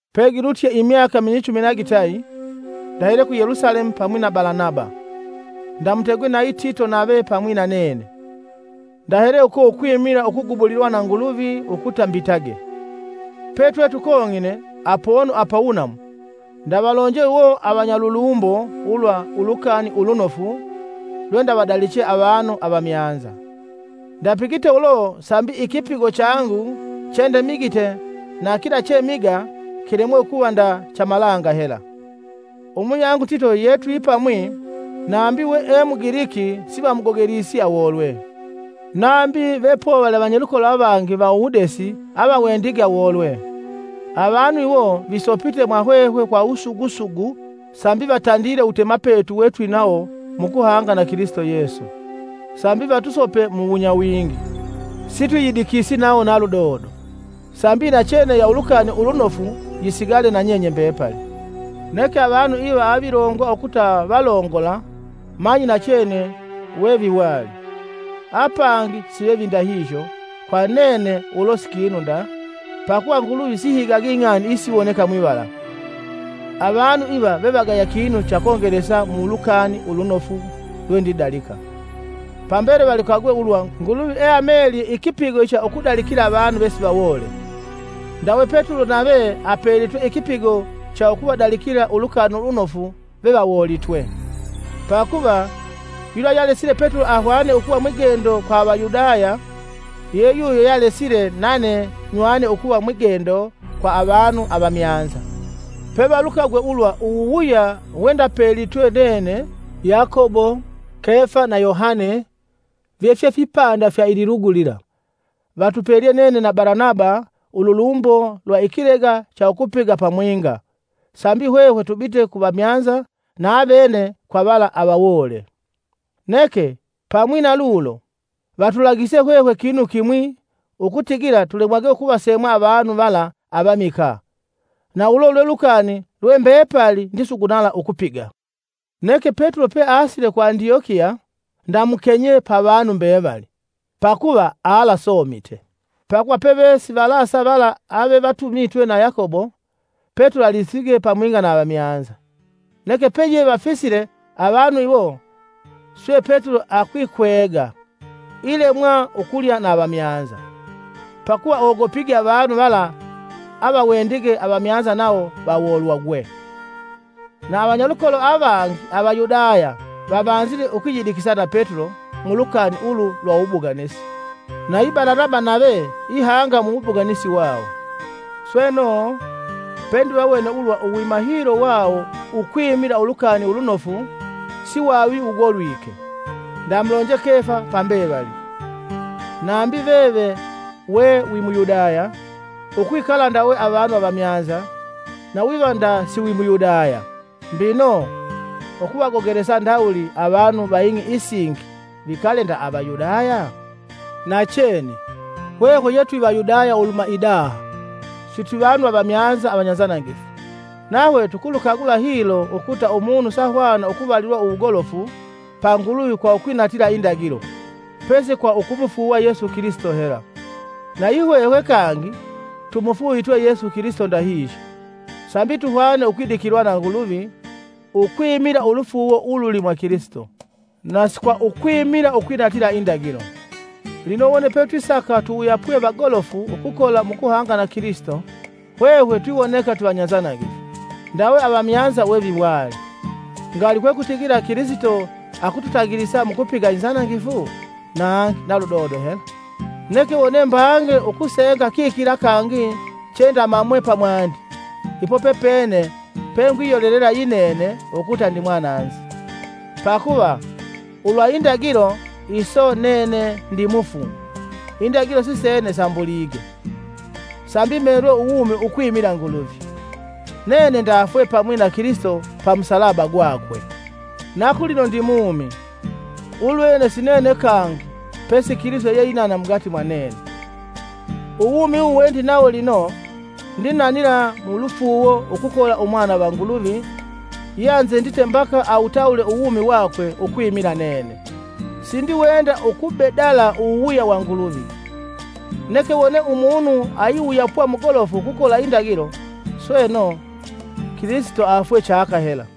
Pegilutye imyaka minyichumi na gitayi, ndahele ku Yelusalemu pamwi na Balanaba; ndamutegwe nayi Tito nave pamwi na nene. Ndahele uko ukwimila ukugubulilwa na Nguluvi ukuta mbitage. Petwe tukong'ine (apono apawunamu) ndavalonje iwo avanyalulumbo ulwa ulukani ulunofu lwendavadaliche avanu avamyanza. Ndapigite ulo sambi ikipigo changu chendemigite na kila chemiga kilemwe ukuva nda cha malanga hela. Umuyangu Tito yetwipamwi, nambi we e mugiliki sivamugogelisi awolwe, nambi vepovali avanyalukolo avangi va uwudesi avawendige awolwe. Avanu iwo visopite mwa hwehwe kwa wusugu sugu sambi vatandile uwutemapetu wetwinawo mukuhanga na Kilisito Yesu, sambi vatusope mu wunyawingi. Sitwiyidikisi nawo na ludodo, sambi inachene ya Ulukani Ulunofu yisigale na nyenye mbepali. Neke avanu iva avilongwa ukuva valongola-manyi nachene weveviwali, apangi sivevindahihyo kwa nene ulo si kinu nda, pakuva Nguluvi sihigagi ing'ani isiwoneka mwivala, avanu iva vevagaya kinu cha kongelesa mulukani ulunofu lwendidalika. Pambele valukagwe ulwa Nguluvi eamelye ikipigo icha ukudalikila avanu vesivawoole, ndawe Petulo nave apelitwe ikipigo cha ukuvadalikila Ulukani Ulunofu vevawoolitwe. Pakuva, yula yealesile Petulo ahwane ukuva mwigendo kwa Avayudaya, ye yuyo yealesile nane nywane ukuva mwigendo kwa avanu avamyanza. Pevalukagwe ulwa uwuwuya wendapelitwe nene Yakobo, Kefa na Yohane vefye fipanda fya ililugu lila, vatupelye nene na Balanaba ululumbo lwa ikilega cha ukupiga pamwinga, sambi hwehwe tubite ku vamyanza na avene kwa vala avawoole. Neke, pamwi na lulo, vatulagise hwehwe kinu kimwi ukutigila tulemwage ukuvasemwa avanu vala avamikaa, na ulo lwe lukani lwe mbepali ndisugunala ukupiga. Neke Petulo peasile ku Andyokiya ndamukenyee pa vanu mbevali, pakuva aalasomite. Pakuva pevesivalasa vala avevatumitwe na Yakobo, Petulo alisige pamwinga na avamyanza. Neke peyevafisile avanu iwo, swe Petulo akwikwega, ilemwa ukulya na avamyanza, pakuva ogopige avanu vala avawendige avamyanza nawo vawoolwagwe. Na avanyalukolo avangi Avayudaya vavanzile ukwiyidikisa na Petulo mulukani ulu lwa uwubuganisi, nayi Balanaba nave ihanga muwubuganisi wawo. Sweno, pendivawene ulwa uwima hilo wawo ukwimila Ulukani Ulunofu swavi wugolwike; ndamulonje Kefa pa mbevali, “Nambi veve we wi Muyudaya, ukwikala ndawe avanu avamyanza na wiva nda si wi Muyudaya! Mbino, ukuvagogelesa ndawuli avanu va ing'i isingi vikale nda Avayudaya?” Nachene, hwehwe ye twi Vayudaya uluhuma idaha, na sitwivanu Avamyanza avanyanzanangifu! Nahwe tukulukagula hilo ukuta umunu sahwana ukuvalilwa wugolofu pa Nguluvi kwa ukwinatila indagilo, pesi kwa ukumufuuwa Yesu Kilisito hela. Nayi hwehwe kangi tumufuuvitwe Yesu Kilisito ndahihyo, sambi tuhwane ukwidikilwa na Nguluvi ukwimila ulufuuwo ululi mwa Kilisito, na si kwa ukwimila ukwinatila indagilo. Lino wone petwisaka tuwuyapwe vagolofu ukukola mukuhanga na Kilisito hwehwe twiwoneka twivanyanzanangifu, ndawe avamyanza weviwali, Ngali kwekutigila Kilisito akututangilisa mukupiga inzanangifu? Nangi na ludodo hela! Neke wone mbange ukusenga kikila kangi chendamamwe pamwandi, ipo pepene pengwiyolelela yinene ukuta ndimwananzi. Pakuva, ulwa indagilo iso nene ndimufu indagilo sisene sambulige, sambi melwe uwumi ukwimila Nguluvi. Nene ndafwe pamwi na Kilisito pa musalaba gwakwe, na kulino ndimumi, ulwene si nene kangi pesi Kilisito yeinana mugati mwa nene. Uwumi uwu we ndinana lino, ndinanila mu lufuuwo ukukola Umwana va Nguluvi yeanzendite mbaka awutawule uwumi wakwe ukwimila nene. Sindiwenda ukubedala uwuwuya wa Nguluvi. Neke wone umunu ayiwuyapwa mugolofu ukukola indagilo, sweno, Kilisito afwee chaka hela!